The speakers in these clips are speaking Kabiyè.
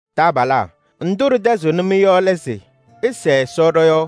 Taabalaa! Ndʋ ɖɩtɛzɩɣnɩ-mɩ yɔ lɛ se: ɩsɛɛ Ɛsɔ ɖɔ-yɔɔ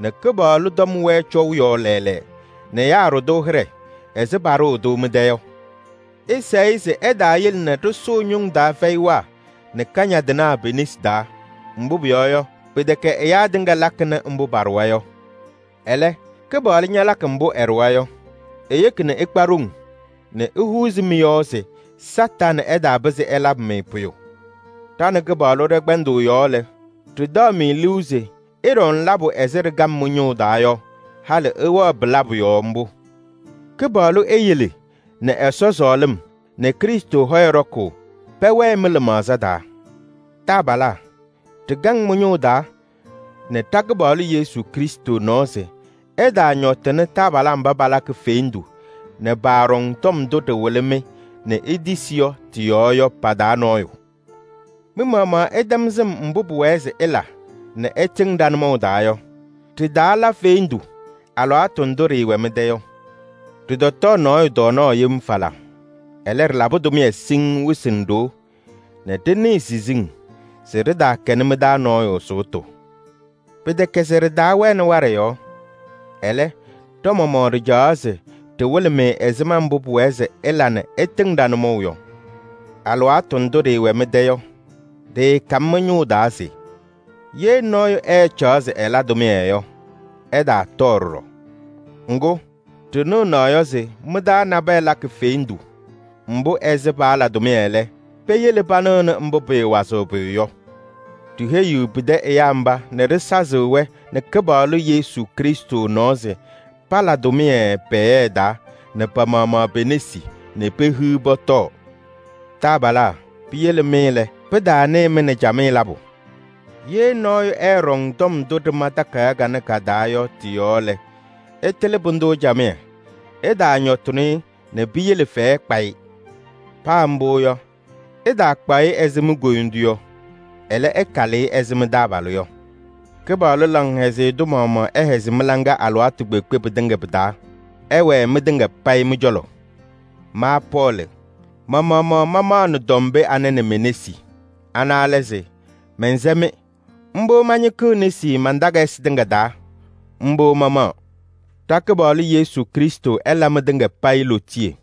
nɛ Kɩpaɣlʋ tɔm wɛɛ cɔʋ yɔɔ lɛɛlɛɛ nɛ ɛyaa ɖʋ-tʋ hɩɖɛ ɛzɩ paɖʋʋ-tʋ mɩ-tɛ yɔ. Ɩsɛɛ-ɩ se ɛtaayele nɛ ɖɩsʋʋ ñʋŋ taa fɛyɩwaa nɛ kañadɩnaa pe-nesi taa. Mbʋ pʋyɔɔ yɔ, pɩtɛkɛ ɛyaa tɩŋa lakɩnɩ mbʋ paɖʋwa yɔ. Ɛlɛ, Kɩpaɣlʋ ñalakɩ mbʋ ɛɖʋwa yɔ. Eyeki nɛ ɩkpa ɖoŋ nɛ ehuuzi mɩ-yɔɔ se Kañadʋ Satanɩ ɛtaapɩzɩ ɛlabɩ-mɩ pʋyʋ. Ɖa nɛ Kɩpaɣlʋ ɖɛ-kpɛndʋʋ yɔɔ lɛ, ɖɩtaɣ-mɩ liu se ɩɖaɣnɩ labʋ ɛzɩ ɖɩkam mɩ-ñʋʋ taa yɔ, halɩ ɩwɛɣ pɩ-labʋ yɔɔ mbʋ. Eyele nɛ Ɛsɔ sɔɔlɩm nɛ Krɩstʋ hɔyɛ ɖɔkʋʋ pɛwɛɛ mɩ-lɩmaɣza taa. Taabalaa! Ɖɩkaŋ mɩ-ñʋʋ taa nɛ ɖa-Kɩpaɣlʋ Yesu Krɩstʋ nɔɔ se ɩtaañɔtɩnɩ taabalaa mba palakɩ fendu nɛ paaɖɔŋ tɔm ndʋ ɖɩwɩlɩ-mɩ nɛ itisi yɔ tɩ-yɔɔ yɔ pa-taa nɔɔyʋ. Mɩ-maɣmaɣ, ɩtɛm sɩm mbʋ pʋwɛɛ se ɩla nɛ ɩtɩŋ ɖa-nʋmɔʋ taa yɔ: ɖɩtaala fendu alɩwaatʋ ndʋ ɖɩɩwɛ mɩ-tɛ yɔ. Ɖɩtɔtɔɔ nɔɔyʋ tɔɔnaɣ yem falaa. Ɛlɛ, ɖɩlabɩ tʋmɩyɛ siŋŋ wɩsɩ nɛ ɖoo nɛ ɖɩnɩɩ siziŋ se ɖɩtaakɛnɩ mɩ-taa nɔɔyʋ sʋʋtʋ. Pɩtɛkɛ se ɖɩtaawɛnɩ waɖɛ yɔɔ. Ɛlɛ, ɖa-maɣmaɣ ɖɩcawa se ɖɩwɩlɩ-mɩ ɛzɩma mbʋ pʋwɛɛ se ɩla nɛ ɩtɩŋ ɖa-nʋmɔʋ yɔ. Alɩwaatʋ ndʋ ɖɩɩwɛ mɩ-tɛ yɔ, ɖɩɩkam mɩ-ñʋʋ taa se: “Ye nɔɔyʋ ɛɛcaɣ se ɛla tʋmɩyɛ yɔ, ɛtaatɔɔ ɖɔɖɔ.” Ŋgʋ, ɖɩnɩɣ naɣ yɔ se mɩ-taa nabɛyɛ lakɩ fendu, ɛzɩ paala tʋmɩyɛ lɛ, peyele panɩɣnɩ mbʋ pɩɩwazɩɣ pʋyʋ yɔ. Ɖiheyiɣ pɩtɛ ɛyaa mba nɛ ɖɩsazɩɣ-wɛ nɛ Kɩpaɣlʋ Yesu Krɩstʋ nɔɔ se pala tʋmɩyɛ pɛɛyɛɛ taa nɛ pa-maɣmaɣ pe-nesi nɛ pehiɣ pɔtɔɔ. Taabalaa! Piyele mɩ lɛ, pɩtaanɩɩ-mɩ nɛ camɩyɛ labʋ. Ye nɔɔyʋ ɛɛɖɔŋ tɔm ndʋ ɖɩma takayaɣ kanɛ ka-taa yɔ tɩ-yɔɔ lɛ, ɩtɩlɩ pʋdʋ camɩyɛ, ɩtaañɔtɩnɩ-ɩ nɛ piyele fɛyɛ kpa-ɩ. Paa mbʋ yɔ, ɩtaakpaɣ-ɩ ɛzɩ mi-koyindu yɔ, ɛlɛ, ɩkalɩ-ɩ ɛzɩ mɩ-taabalʋ yɔ. Kɩpaɣlʋ laŋhɛzɩyɛ tʋ maɣmaɣ ɛhɛzɩ mɩ-laŋa alɩwaatʋ kpeekpe pɩtɩŋa pɩ-taa! Ɛwɛɛ mɩtɩŋa payɩ mɩ-cɔlɔ! Ma Pɔɔlɩ, ma-maɣmaɣ mamaɣnɩ tɔm pee anɛ nɛ me-nesi. Ana lɛ se: mɛnsɛ-mɩ. Mbʋ mañɩkɩɣ nesi man-takayɩsɩ tɩŋa taa. Mbʋ mamaɣ. Ɖa-Kɩpaɣlʋ Yesu Krɩstʋ ɛla mɩtɩŋa payɩ lootiye!